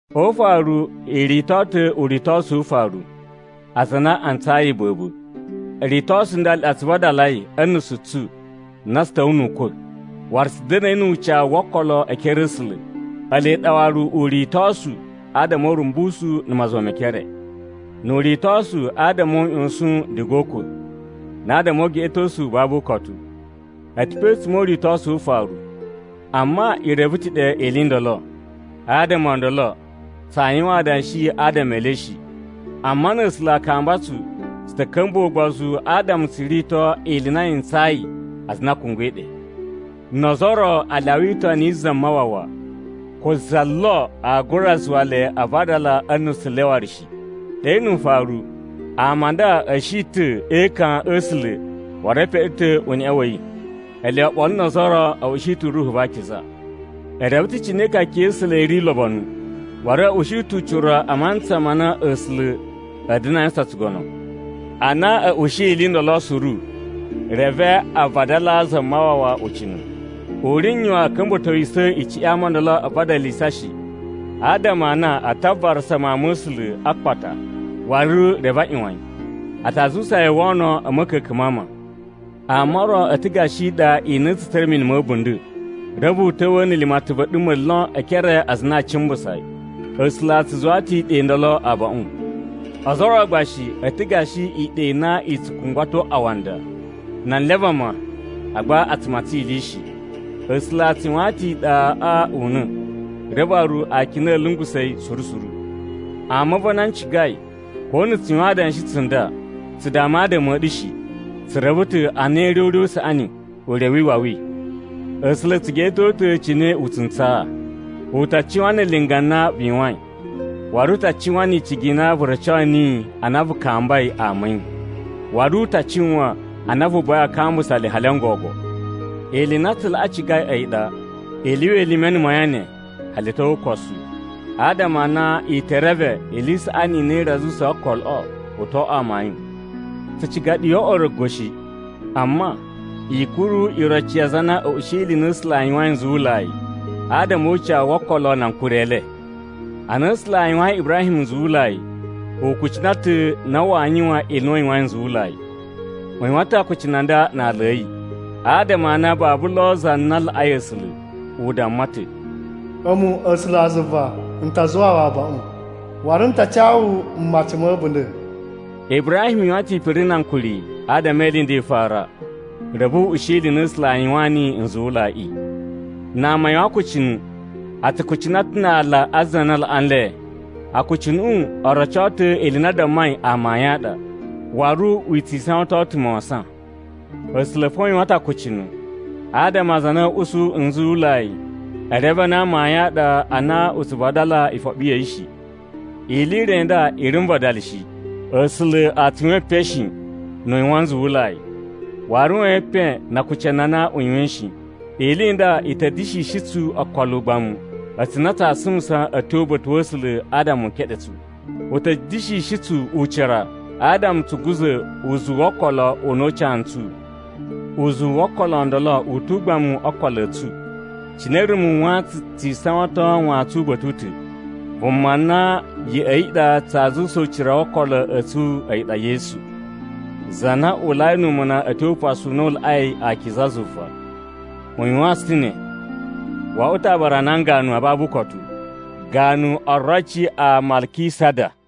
O ufaru i rito ta̱ uritosu wu ufaru, aza a na a ntsayi iba̱ba̱. Ritosu n nda ele ɗa tsu vadalai a̱ nusu tsu na tsu ta̱wa̱a̱ nu ukwa̱, waru tsu da̱na̱i nu ucawu wo okolo e ekere a̱ A̱sula̱. Ele ɗa waru uritosu adama o urumbusu na̱ mazuwa me ekere. Nu uritosu adama o uꞌyosun diga o ukwa̱, na adama o ugeꞌetosu u babu ukotu, a̱ ta̱ pe a̱tsuma̱ o uritosu wu ufaru. Amma i reve ta̱ ɗe ili i ndolo. Adama o ndolo, tsaa yuwan adanshi adama e le shi. Amma na̱ A̱sula̱ a kamba tsu, tsu ta̱ ka̱mbuwa̱ ugbozu adama tsu rito ili i na yi ntsayi aza a na a kungwai ɗe. No ozo o ro a lyawa itoni yi Zamawawa, ko za lo aa gura zuwa le a vadala a̱ nusu le waru shi. Ɗe nu ufaru, ama a nda a̱ shi ta̱ e ekan a̱ A̱sula̱ waru e peɗe ta̱ uneꞌe wa̱ yi. Ele oɓolo no ozo o ro a̱ ushi ta̱ Ruhu va Akiza. E reve ta̱ cine ikaka ya̱ A̱sula̱ i ri ulobonu, waru a̱ ushi ta̱ ucira u mantsa ma na A̱sula̱ a̱a̱ da̱na̱ a yuwusan tsugono. Ana a̱ ushiyi ili i ndolo suru, reve a vadalaa Zamawawa ucina̱. U ri n yuwan a̱ ka̱mba̱towisa̱ icuꞌun ya ama o ndolo a vadalisa shi adama a na a ta varasa Mawun ma̱ A̱sula̱ a akpata waru reve a ꞌyuwan yi. A ta zuwusa yi o wono a̱ ma̱ka̱ka̱n ma ama. Ama o ro a̱ ta̱ gashi iɗa i na i tsu tsura̱ mini ma̱ a̱bunda̱. Reve u ta̱wa̱a̱ na̱ limatan va̱ a̱ɗuma̱ lon e ekere a aza a na a cimbusa yi. A̱sula̱ a tsu zuwaa ta̱ iɗa i ndolo abaꞌun. Ozo o ro gba shi a̱ ta̱ gashi iɗa i na i tsu kungwato awanda na anlya a vama agba a tsu matsan ili shi. A̱sula̱ a tsu yuwaan ta̱ iɗaꞌa una̱, reve waru akina a̱ lungusa̱ yi suru suru. Ama a̱ va̱ a na n cigai, ko na̱ tsu yuwan adanshi tsunda, tsu dama adama a̱ ɗu shi. Tsu reve ta̱ a na i ri o ure u saꞌani, ure wi iwawi. A̱sula̱ a̱ tsu geꞌeto ta̱ cine u tsu ntsaa. U ta cuwan na̱ linga na vu yuwain, waru u ta cuwan ni icigi i na vu roco niyi ana vu kambai ama a̱ yi. Waru u ta cuwan a na vu buwai a kambusa le hali n gogo. Ili i na tsu laꞌa cigai a̱yi ɗa, i lyuwa elime na̱ mayan ne hali a̱ tyo o ukosu, adama a na i ta̱ reve ili i saꞌani i na i ri a zuwusa okoloꞌo u too oꞌwo amayun. Tsu ciga ɗu yo oꞌwo orogo shi. Amma, i kuru iroci ya aza a na a̱ ushiyi ili i na A̱sula̱ a yuwain nzuwulai adama o ucawu wo okolo na ankuri e le. Ana A̱sula̱ a yuwayin Ibrahim nzuwulai, u kucina ta̱ na waa yuwan ili i na u yuwain nzuwulai. U yuwan ta̱ akucunu a nda na ala a̱ yi, adama a na babu lo za na laꞌai A̱sula̱. U damma ta̱, “A̱mu A̱sulazuva, n ta zuwaa wu abaꞌun, waru n ta ca wu mmaci ma̱ a̱bunda̱!” Ibrahim yuwan ta̱ ipiri na ankuri adama ili i nda i fara, reve u ushi ili i na A̱sula̱ a yuwaan niyi nzuwulaiꞌi. Na ama a yuwan akucunu, a tsu kucina ta̱ na aala a za na laꞌa nle. Akucunuꞌu o roco ta̱ ili i na a dammai amayun a ɗa, waru u tsi isawaton ta̱ mawasan. A̱sula̱ fo u yuwan ta̱ akucunu, adama aza a na a̱a̱ usu nzuwulai e reve a na amayun a ɗa a na u tsu vadala ifoɓi ya̱ yi shi. Ili i re i nda i ri n vadala shi: A̱sula̱ a tsu yuwan epen shi nu u yuwan nzuwulai, waru waa yuwan epen na akucunu a na u yuwain shi. Ili i nda i ta̱ da̱shishi tsu okolo ugbamu a̱tsu na tsaa sumusa a̱ tyo uba̱ta̱ wa̱ A̱sula̱ adama u keɗe tsu. U ta̱ da̱shishi tsu ucira adama tsu guza̱ uzuwu wo okolo u na u ca ntsu. Uzuwu wo okolo o ndolo u tu ugbamu o okolo a̱ tsu, cine rumu wantsun tsi isawaton wantsun uba̱ta̱ u ta̱. Vuma na ya̱ꞌa̱ yi ɗa tsaa zuwusa uzuwu wo okolo a̱ tsu a̱yi ɗa Yesu, za na uwulai nu umuna a̱ tyo Upasu u na u Laꞌai Akiza zuva. U yuwaan tsu ta̱ ne. Wo oꞌwo ta̱ aabara a nan ganu a babu ukotu, ganu oroci a Malkisada.